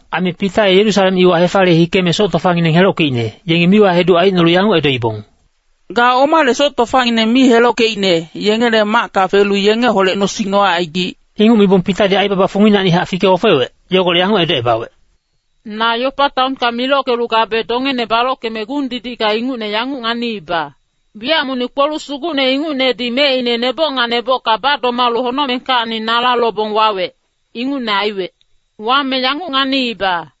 Aime Pita ye Yerusalem iwa hefaliye hikeme soc tofangineng helockeicne, yengi miwa-heduc aicnolu yanguc edoibong, “Ga omale soc tofangineng mi helockeicne, yengele macka felu yengeholec nosing nocaigic?” Inguc mibong Pitadi aibaba funginacnihac fike-ofewec, yogolec yanguc edocebawec, “Na Yopa taonka milockelu gabe dongene balockeme gung-didicka ingucne yanguc nganiiba. Wiyac monic kpoluc sugucne ingucnedi mecine neboc nga nebocka badomalu honocmengkacni nala lobong wawec, ingucne aiwec. Wame yanguc nganiiba,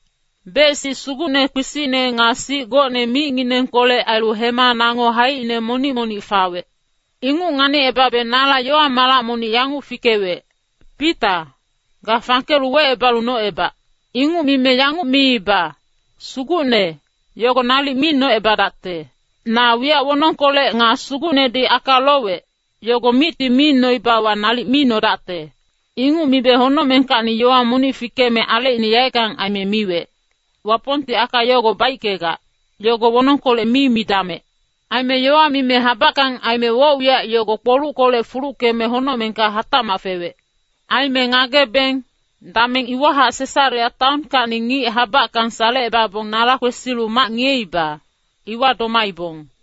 bec-sic sugucne kpisicne nga sic gocne micnginengkolec ailu hema nango haicine monic-monic fawec. Inguc nganicebabe nala yowa malac monic yanguc fikewec, ‘Pita, ga fangkelu wecebalu nocebac.’ “Inguc mime yanguc miiba, ‘Sugucne, yogo nalic mi nocebadacte! Na wiyac wonongkolec nga Sugucnedi aka lowec, yogo micti mi noibawa nalic mi nodacte.’ “Inguc mibe honocmengkacni yowa monic fikeme alecine yaeckang aime miwec, ‘Wapongti aka yogo baickegac, yogo wonongkolec mi midamec.’ Aime yowa mime habackang aime woc-wiyac yogo kpoluckolec fuluckeme honocmengka hatacmac fewec. “Aime ngagebeng, dameng iwahac Sesarea taonkacni ngic habackang salecebabong nala kwesilu mac ngiyeiba, iwa domaibong.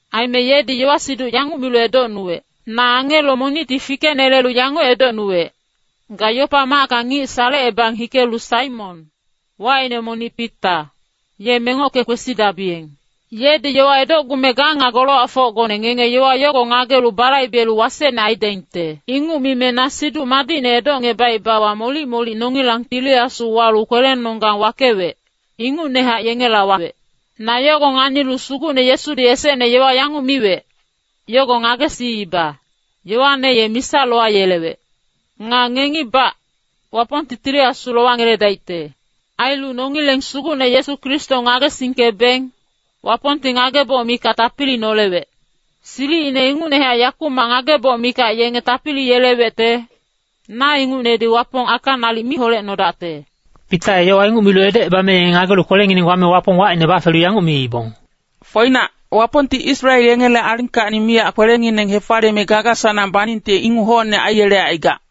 Aime yedi yowa-siduc yanguc milu edocnubawec. ‘Na angelo monicti fikenelelu yanguc edocnuwec, “Ga Yopa macka ngic salecebang hikelu Saimon, wacine monic Pita, ye mengocke kwesidabiyeng. Yedi yowa edocgume ga nga golowacfocgone ngenge yowa yogo ngagelu balaibelu wasecne aidaingte.” ’ “Inguc mime na Siduc Madicne edocebaebewa molic-molic nongilang Tili Asu walu kwelenonggang wakewec, ingucnehac yengela wawec. Na yogo nganilu Sugucne Yesudi esecne yowa yanguc miwec, yogo ngagesiiba, ‘Yoane ye misa lowayelewec. Nga ngengibac, Wapongti Tili Asu lowangeledaicte.’ Ailu nongileng Sugucne Yesu Kristo ngagesingkebeng, Wapongti ngageboc mikac tapili nolewec. Silicine ingucnehac yakumac ngageboc mikac yenge tapili yelewecte, na ingucnedi Wapong aka nalic mi holecnodacte.” Pita ye yowa inguc milu edocebame yenge ngagelu kwelengineng wame Wapong wacine bafelu yanguc miibong, “Foinac, Wapongti Israel yengele alingkacni miyac kwelengineng hefaliyeme gaga-sanang baningte inguc hocne aiyelegac.”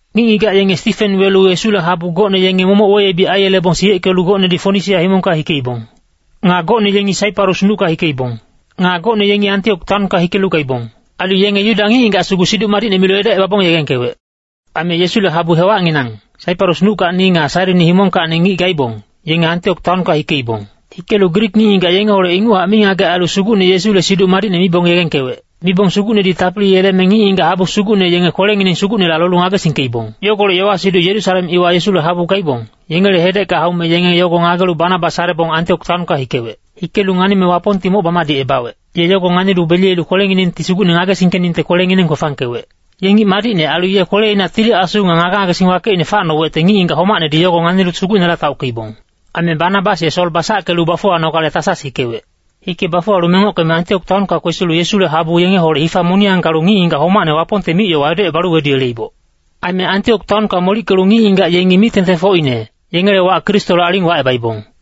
Ngic-ngigac yenge Stifen welu Yesule habu gocne yenge momoc weyebic aiyelebong siyeckelu gocnedi Fonisia himongka hikeibong. Nga gocne yengi Saiparus nucka hikeibong. Nga gocne yengi Antiok taonka hikelu gaibong. Ailu yenge Yuda ngic-ngigac sugu Siduc Madicne milu edocebabong yegengkewec. Aime Yesule habu hewacnginang, Saiparus nuckacni nga Sairini himongkacni ngic gaibong, yenge Antiok taonka hikeibong. Hikelu Grik ngic-ngigac yengeholec inguchac mingagec ailu Sugucne Yesule Siduc Madicne mibong yegengkewec. Mibong Sugucnedi tapili yeleme ngic-ngigac habu sugucne yenge kwelengineng Sugucnela lolu ngagesingkeibong. Yogolec yowa-siduc Yerusalem iwa Yesule habu gaibong, yengele hedecka haume yenge yogo ngagelu Banabas salebong Antiok taonka hikewec. Hikelu nganime Wapongti moc bamadicebawec, ye yogo nganilu beliyelu kwelenginengti Sugucne ngagesingkeningte kwelengineng kwefangkewec. Ye ngic madicne ailu ye kweleina Tili Asu nga ngage-ngagesing wakeicne facnowecte ngic-ngigac homacnedi yogo nganilu Sugucnela taockeibong. Aime Banabas ye Sol basackelu bafuwanogale Tasas hikewec. Hike bafuwalu mengockeme Antiok taonka kwesilu Yesule habu yengeholec hifa moniyang galu ngic-ngigac homacne Wapongte mic-yowa edocebalu weduyeleiboc. Aime Antiok taonka molickelu ngic-ngigac yengi mic-tengtengfocine, yengele wac Kristole aling wacebaibong.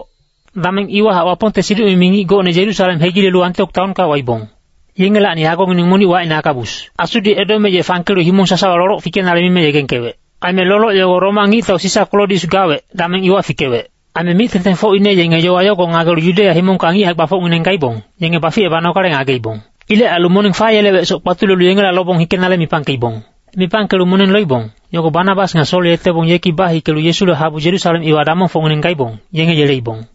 Dameng iwahac Wapongte siduc-mimi ngic gocne Yerusalem hegilelu Antiok taonka waibong. Yengelacni agongineng monic wacine Agabus. Asudi edome ye fangkelu himong sasawa loloc fikenale mime yegengkewec. Aime loloc yogo Roma ngictau Sisa Klodius gawec, dameng iwa fikewec. Aime mic-tengtengfocine yenge yowa yogo ngagelu Yudeya himongka ngic hae-gbafocngineng gaibong, yenge baficebanogale ngageibong. Ilec ailu moneng fayelewecsoc kpatulelu yengela lobong hikenale mipangkeibong. Mipangkelu moneng loibong, yogo Banabas nga Sol yetebong yeki bahikelu Yesule habu Yerusalem iwa damongfocngineng gaibong, yenge yeleibong.